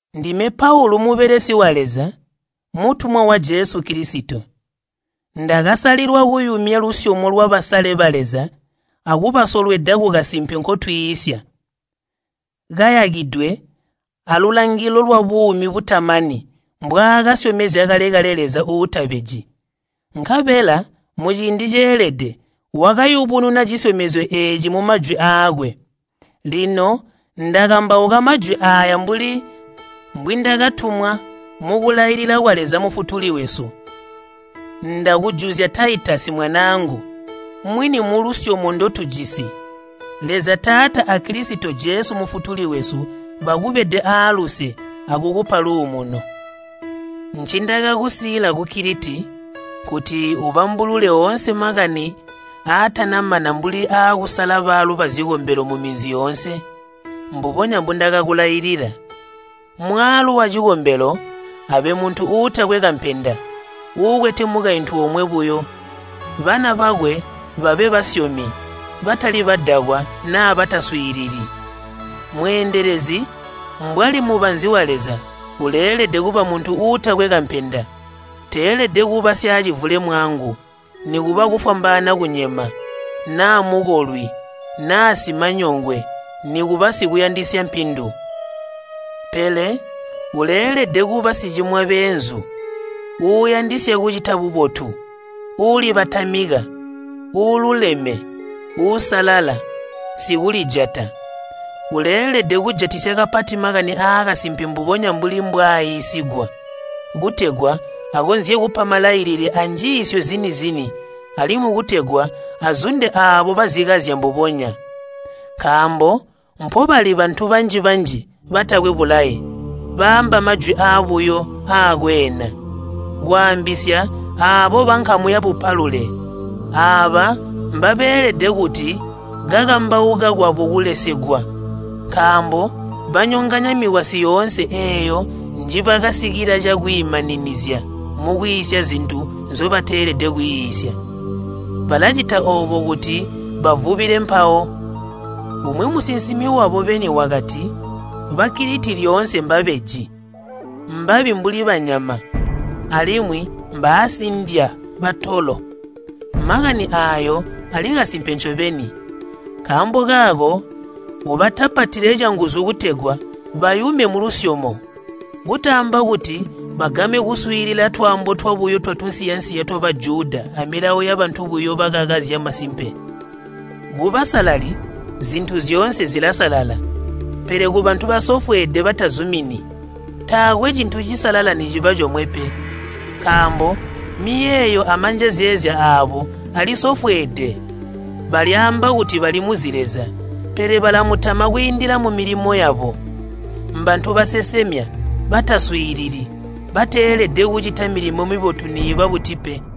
Ndime Paulu mubelesi wa Leza, mutumwa wa Jesu Kilisito. Ndakasalilwa kuyumya lusyomo lwabasale ba Leza akubasolweda kukasimpe nkotwiisya, kayakidwe alulangilo lwabuumi butamani mbwaakasyomezya kale-kale Leza uutabeji. Nkabela muciindi ceelede wakayubununa cisyomezyo eeci mumajwi aakwe. Lino ndakambauka majwi aaya mbuli mbwindakatumwa mukulailila kwa Leza Mufutuli wesu. Ndakujuzya Taitasi mwanaangu mwini mulusyomo ndotujisi. Leza Taata a Kilisito Jesu Mufutuli wesu bakubede aaluse akukupa luumuno. Ncindakakusiila ku Kiliti nkuti ubambulule oonse makani aatanamana mbuli aakusala baalu bazikombelo muminzi yoonse mbubonya mbundakakulailila. Mwaalu wacikombelo abe muntu uutakwe kampenda, uukwete mukaintu omwe buyo. Bana bakwe babe basyomi, batali badakwa naa bataswiilili. Mweendelezi mbwali mubanzi wa Leza, uleelede kuba muntu uutakwe kampenda. Teelede kuba syaacivulemwangu, nikuba uufwambaana kunyema, naa mukolwi, naa simanyongwe, nikuba sikuyandisya mpindu. Pele uleelede kuba sicimwa beenzu, uuyandisya kucita bubotu, uulibatamika, uululeme, uusalala, sikulijata. Uleelede kujatisya kapati makani aakasimpe mbubonya mbuli mbwaaiisigwa, kutegwa akonzye kupa malailile anjiisyo zini-zini alimwi kutegwa azunde aabo bazikazya mbubonya. Nkaambo mpobali bantu banji-banji batakwe bulaye, baamba majwi aabuyo aakweena, kwaambisya aabo bankamu yabupalule. Aaba mbabeelede kuti kukambauka kwabo kulesegwe, nkaambo banyonganya mikwasyi yoonse eeyo njibasikila cakwiimaninizya mukwiisya zintu nzobateelede kwiisya. Balacita oobo kuti bavubile mpawo. Umwi musinsimi wabo beni wakati, “Ba Kiliti lyoonse mbabeji, mbabi mbuli banyama, alimwi mbaasindya batolo.” Makani aayo ali kasimpe ncobeni. Nkaambo kaako ubatapatile canguzu kutegwa bayume mulusyomo. Kutaamba kuti bagame kuswiilila twaambo twabuyo twatunsiya-nsiya twa Bajuda amilawo yabantu buyo bakaka zyamasimpe. Kubasalali zintu zyoonse zilasalala, pele kubantu basofweede batazumini, taakwe cintu cisalala niciba comwe pe, nkaambo miyeeyo amanjezeezya aabo alisofweede. Balyaamba kuti balimuzi Leza pele balamutama kwiindila mumilimo yabo. Mbantu basesemya, bataswiilili, bateelede kucita milimo mibotu niiba buti pe.